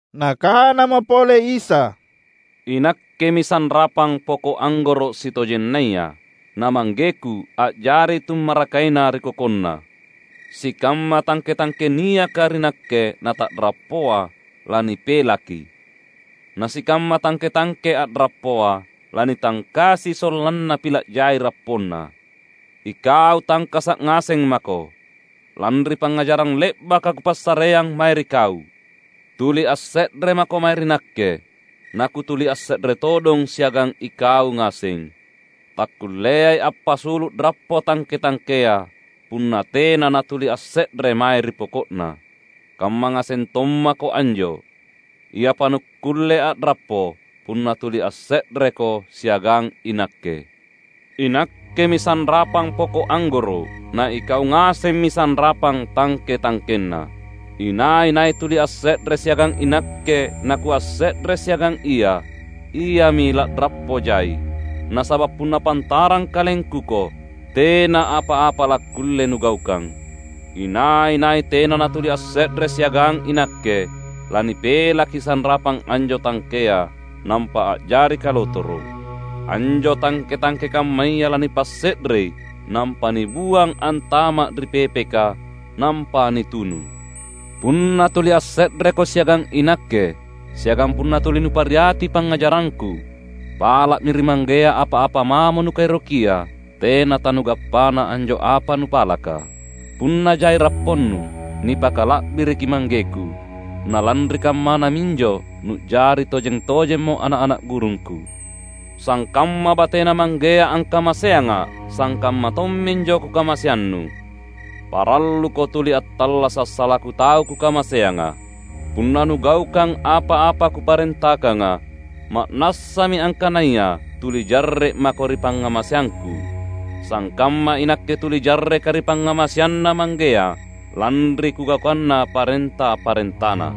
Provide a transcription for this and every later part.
Nakanamo pole Isa, "INakkemi sanrapang poko’ anggoro’ sitojennaya, na ManggeKu a’jari Tummarakaina ri kokonNa. Sikamma tangke-tangke niaka ri Nakke nata’rappoa, lanipelaki. Na sikamma tangke-tangke a’rappoa, lanitangkasi sollanna pila’ jai rapponna. Ikau tangkasa’ ngaseng mako, lanri pangngajarang le’baka Kupassareang mae ri kau. Tuli asse’re mako mae ri Nakke, naKutuli asse’re todong siagang ikau ngaseng. Takkulleai appasulu’ rappo tangke-tangkea, punna tena natuli asse’re mae ri poko’na. Kamma ngaseng tommako anjo; iapa nukkulle a’rappo, punna tuli asse’reko siagang iNakke. INakkemi sanrapang poko’ anggoro’, na ikau ngasemmi sanrapang tangke-tangkenna. Inai-nai tuli asse’re siagang iNakke naKuasse’re siagang ia, iami la’rappo jai; nasaba’ punna pantarang KalengKuko, tena apa-apa lakkulle nugaukang. Inai-nai tena natuli asse’re siagang iNakke, lanipelaki sanrapang anjo tangkea, nampa a’jari kalotoro’. Anjo tangke-tangke kammaya lanipasse’rei, nampa nibuang antama’ ri pepeka, nampa nitunu. Punna tuli asse’reko siagang iNakke, siagang punna tuli nupariati pangngajarangKu, pala’mi ri Manggea apa-apa mamo nukaerokia; tena tanugappana anjo apa nupalaka. Punna jai rapponnu, nipakala’biriki ManggeKu; na lanri kammana minjo nu’jari tojeng-tojemmo ana’-ana’ gurungKu. Sangkamma bateNa Manggea angkamaseangA’, sangkamma tomminjo Kukamaseannu. Paralluko tuli attallasa’ salaku tau Kukamaseanga. Punna nugaukang apa-apa Kuparentakanga, ma’nassami angkanaya tuli jarre’ mako ri pangngamaseangKu; sangkamma iNakke tuli jarreKa’ ri pangngamaseanNa Manggea, lanri Kugaukanna parenta-parentaNa.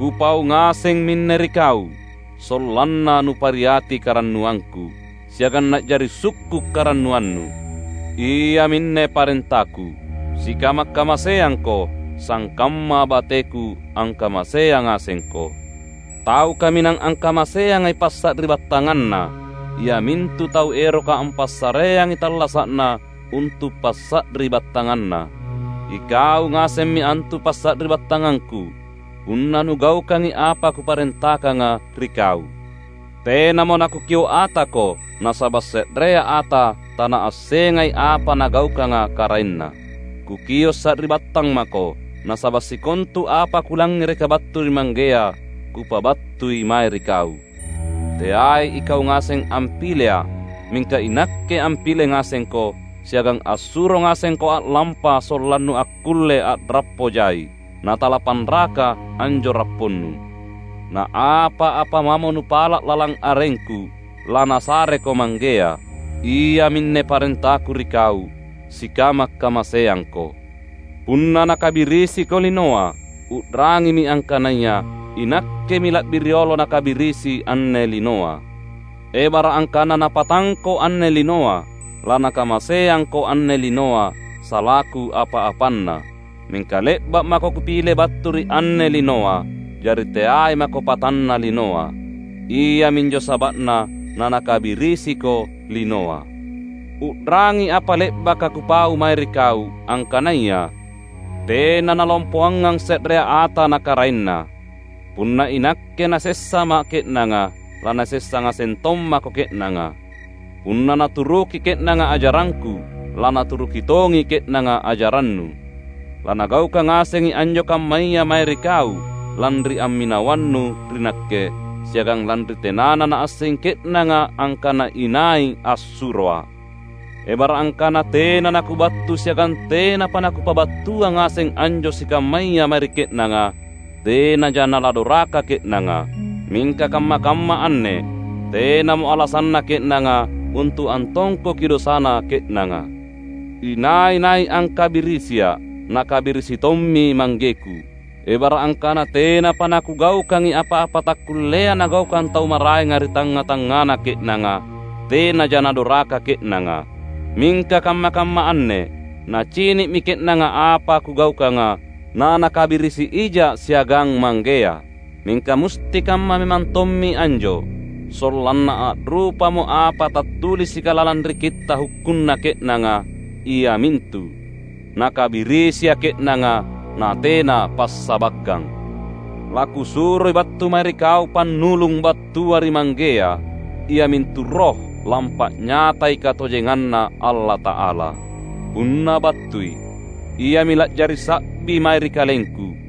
Kupau ngaseng minne ri kau, sollanna nupariati karannuangKu, siagang na’jari sukku’ karannuannu. Iaminne parentaKu: Sikama’-kamaseangko, sangkamma bateKu angkamaseang ngasengko. Tau kaminang angkamaseangai passari’battanganna, iamintu tau eroka ampassareangi tallasa’na untu’ passari’battanganna. Ikau ngasemmi antu passari’battangangKu, punna nugaukangi apa Kuparentakanga ri kau. Tenamo naKukio’ atako nasaba’ se’rea ata tanaassengai apa nagaukanga karaenna. Kukio’ sari’battang mako, nasaba’ sikontu apa Kulangngereka battu ri Manggea Kupabattui mae ri kau. Teai ikau ngaseng ampileA’. Mingka iNakke ampile ngasengko, siagang assuro ngasengko a’lampa sollannu akkulle a’rappo jai — natalapanraka anjo rapponnu. Na apa-apa mamo nupala’ lalang arengKu, laNasareko Manggea. Iaminne parentaKu ri kau: Sikama’-kamaseangko." "Punna nakabirisiko linoa, u’rangimi angkanaya iNakkemi la’bi riolo nakabirisi anne linoa. Ebara’ angkana napatangko anne linoa, lanakamaseangko anne linoa salaku apa-apanna. Mingka le’ba’ mako Kupile battu ri anne linoa, jari teai mako patanna linoa. Iaminjo saba’na nanakabirisiko linoa. U’rangi apa le’baka Kupau mae ri kau, angkanaya, ‘Tena nalompoangang se’rea ata na karaenna.’ Punna iNakke nasessaMa’ ke’nanga, lanasessa ngaseng tommako ke’nanga. Punna naturuki ke’nanga ajarangKu, lanaturuki tongi ke’nanga ajarannu. Lanagaukang ngasengi anjo kammaya mae ri kau, lanri amminawannu ri Nakke, siagang lanri tenana naassengi ke’nanga angkana inai assuroA’. Ebara’ angkana tena naKubattu siagang tenapa naKupabattuang ngaseng anjo sikammaya mae ri ke’nanga, tenaja naladoraka ke’nanga. Mingka kamma-kamma anne tenamo alasanna ke’nanga untu’ antongkoki dosana ke’nanga. Inai-nai angkabirisiA’, nakabirisi tommi ManggeKu. Ebara’ angkana tenapa naKugaukangi apa-apa takkullea nagaukang tau maraenga ri tangnga-tangngana ke’nanga, tenaja nadoraka ke’nanga. Mingka kamma-kamma anne nacini’mi ke’nanga apa Kugaukanga, nanakabirisi ijA’ siagang Manggea. Mingka musti kamma memang tommi anjo, sollanna a’rupamo apa tattulisika lalang ri Kitta’ Hukkunna ke’nanga, iamintu: ‘NakabirisiA’ ke’nanga, natena passabakkang.’ LaKusuroi battu mae ri kau Pannulung battua ri Manggea. Iamintu Roh, lampa’nyatai katojenganNa Allata’ala. Punna battui, Iami la’jari sa’bi mae ri KalengKu.